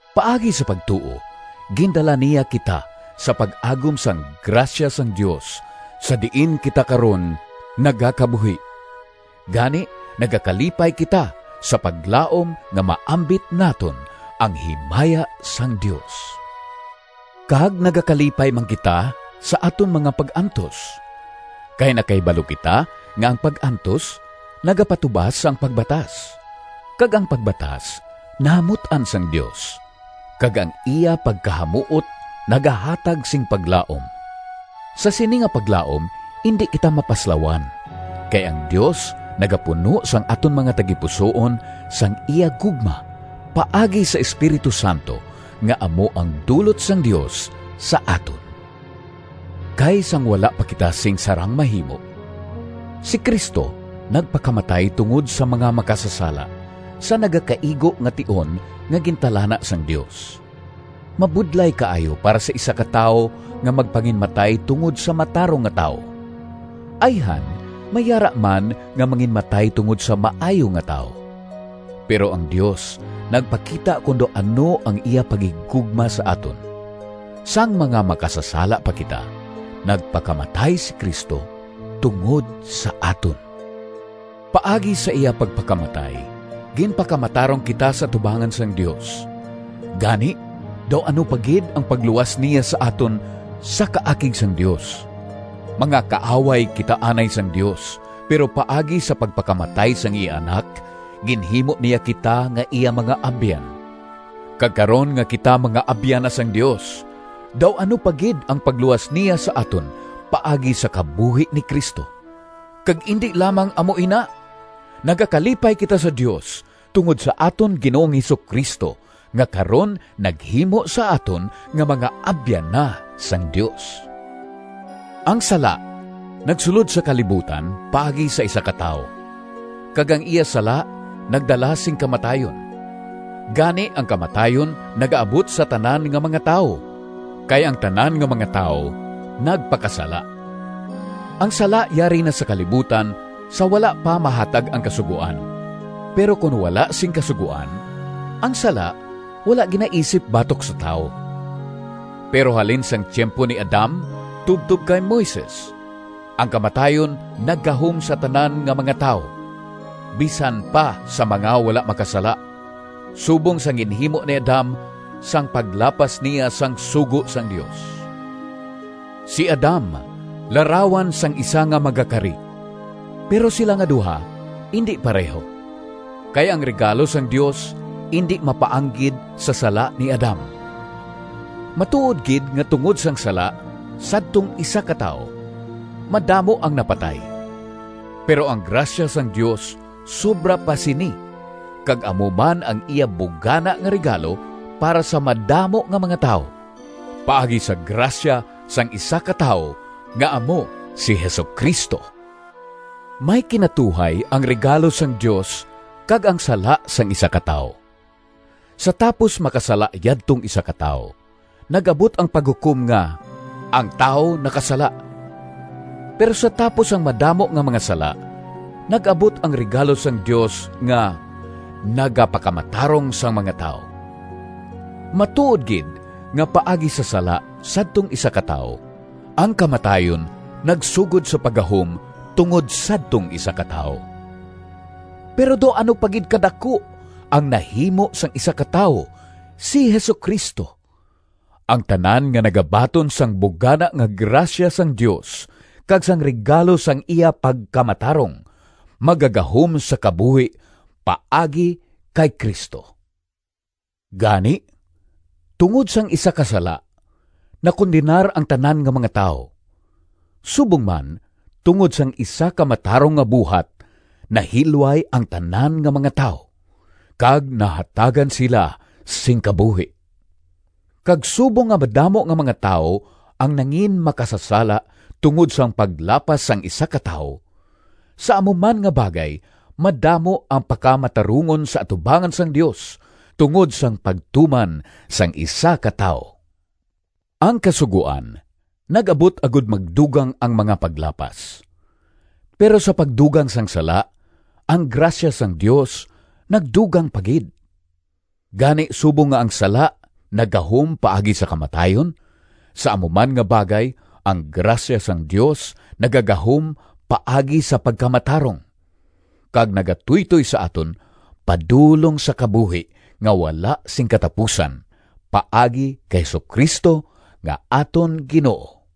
Paagi sa pagtuo, gindala niya kita sa pag-agom sang grasya sang Dios sa diin kita karon nagakabuhi. Gani, nagakalipay kita sa paglaom nga maambit naton ang himaya sang Dios! Kag nagakalipay man kita sa aton mga pag-antos, kay nakahibalo kita nga ang pag-antos nagapatubas sang pagbatas, kag ang pagbatas nahamut-an sang Dios, kag ang iya pagkahamuot nagahatag sing paglaom. Sa sini nga paglaom indi kita mapaslawan, kay ang Dios nagapuno sang aton mga tagipusoon sang iya gugma paagi sa Espiritu Santo, nga amo ang dulot sang Dios sa aton. Kay sang wala pa kita sing sarang mahimo, si Cristo nagpakamatay tungod sa mga makasasala, sa nagakaigo nga tion nga gintalana sang Dios. Mabudlay kaayo para sa isa ka tawo nga magpanginmatay tungod sa matarong nga tawo. Ayhan may yara man nga manginmatay tungod sa maayo nga tawo. Pero ang Dios nagpakita kon daw ano ang iya paghigugma sa aton. Sang mga makasasala pa kita, nagpakamatay si Cristo tungod sa aton! Paagi sa iya pagpakamatay, ginpakamatarong kita sa atubangan sang Dios. Gani, daw ano pa gid ang pagluwas niya sa aton sa kaakig sang Dios. Mga kaaway kita anay sang Dios, pero paagi sa pagpakamatay sang iya Anak, ginhimo niya kita nga iya mga abyan. Kag karon nga kita mga abyan na sang Dios, daw ano pa gid ang pagluwas niya sa aton paagi sa kabuhi ni Cristo! Kag indi lamang amo ina! Nagakalipay kita sa Dios tungod sa aton Ginoong Jesu-Cristo, nga karon naghimo sa aton nga mga abyan na sang Dios. Ang sala nagsulod sa kalibutan paagi sa isa ka tawo, kag ang iya sala nagdala sing kamatayon. Gani, ang kamatayon nagaabot sa tanan nga mga tawo, kay ang tanan nga mga tawo nagpakasala. Ang sala yari na sa kalibutan sa wala pa mahatag ang Kasugoan. Pero kon wala sing kasugoan, ang sala wala ginaisip batok sa tawo. Pero halin sang tiyempo ni Adam tubtob kay Moises, ang kamatayon naggahom sa tanan nga mga tawo, bisan pa sa mga wala makasala, subong sang ginhimo ni Adam sang paglapas niya sang sugo sang Dios. Si Adam larawan sang isa nga magakari. Pero sila nga duha indi pareho. Kay ang regalo sang Dios indi mapaanggid sa sala ni Adam. Matuod gid nga tungod sang sala sadtong isa ka tawo, madamo ang napatay. Pero ang grasya sang Dios sobra pa sini kag amo man ang iya bugana nga regalo para sa madamo nga mga tawo, paagi sa grasya sang isa ka tawo nga amo si Jesu-Cristo. May kinatuhay ang regalo sang Dios kag ang sala sang isa ka tawo. Sa tapos makasala yadtong isa ka tawo, nag-abot ang paghukom nga “Ang tawo nakasala”; pero sa tapos sang madamo nga mga sala nag-abot ang regalo sang Dios nga “Nagapakamatarong sang mga tawo!” Matuod gid nga paagi sa sala sadtong isa ka tawo, ang kamatayon nagsugod sa paggahom tungod sadtong isa ka tawo. Pero daw ano pa gid kadaku ang nahimo sang isa ka tawo, si Jesu-Cristo! Ang tanan nga nagabaton sang bugana nga grasya sang Dios kag sang regalo sang iya pagkamatarong magagahom sa kabuhi paagi kay Cristo. Gani, tungod sang isa ka sala nakondenar ang tanan nga mga tawo, subong man tungod sang isa ka matarong nga buhat nahilway ang tanan nga mga tawo, kag nahatagan sila sing kabuhi. Kag subong nga madamo nga mga tawo ang nanginmakasasala tungod sang paglapas sang isa ka tawo, sa amo man nga bagay madamo ang pakamatarungon sa atubangan sang Dios tungod sang pagtuman sang isa ka tawo. Ang Kasugoan nag-abot agod magdugang ang mga paglapas. Pero sa pagdugang sang sala, ang grasya sang Dios nagdugang pa gid. Gani, subong nga ang sala naggahom paagi sa kamatayon, sa amo man nga bagay ang grasya sang Dios nagagahom paagi sa pagkamatarong, kag nagatuytoy sa aton padulong sa kabuhi nga wala sing katapusan, paagi kay Jesu-Cristo nga aton Ginoo.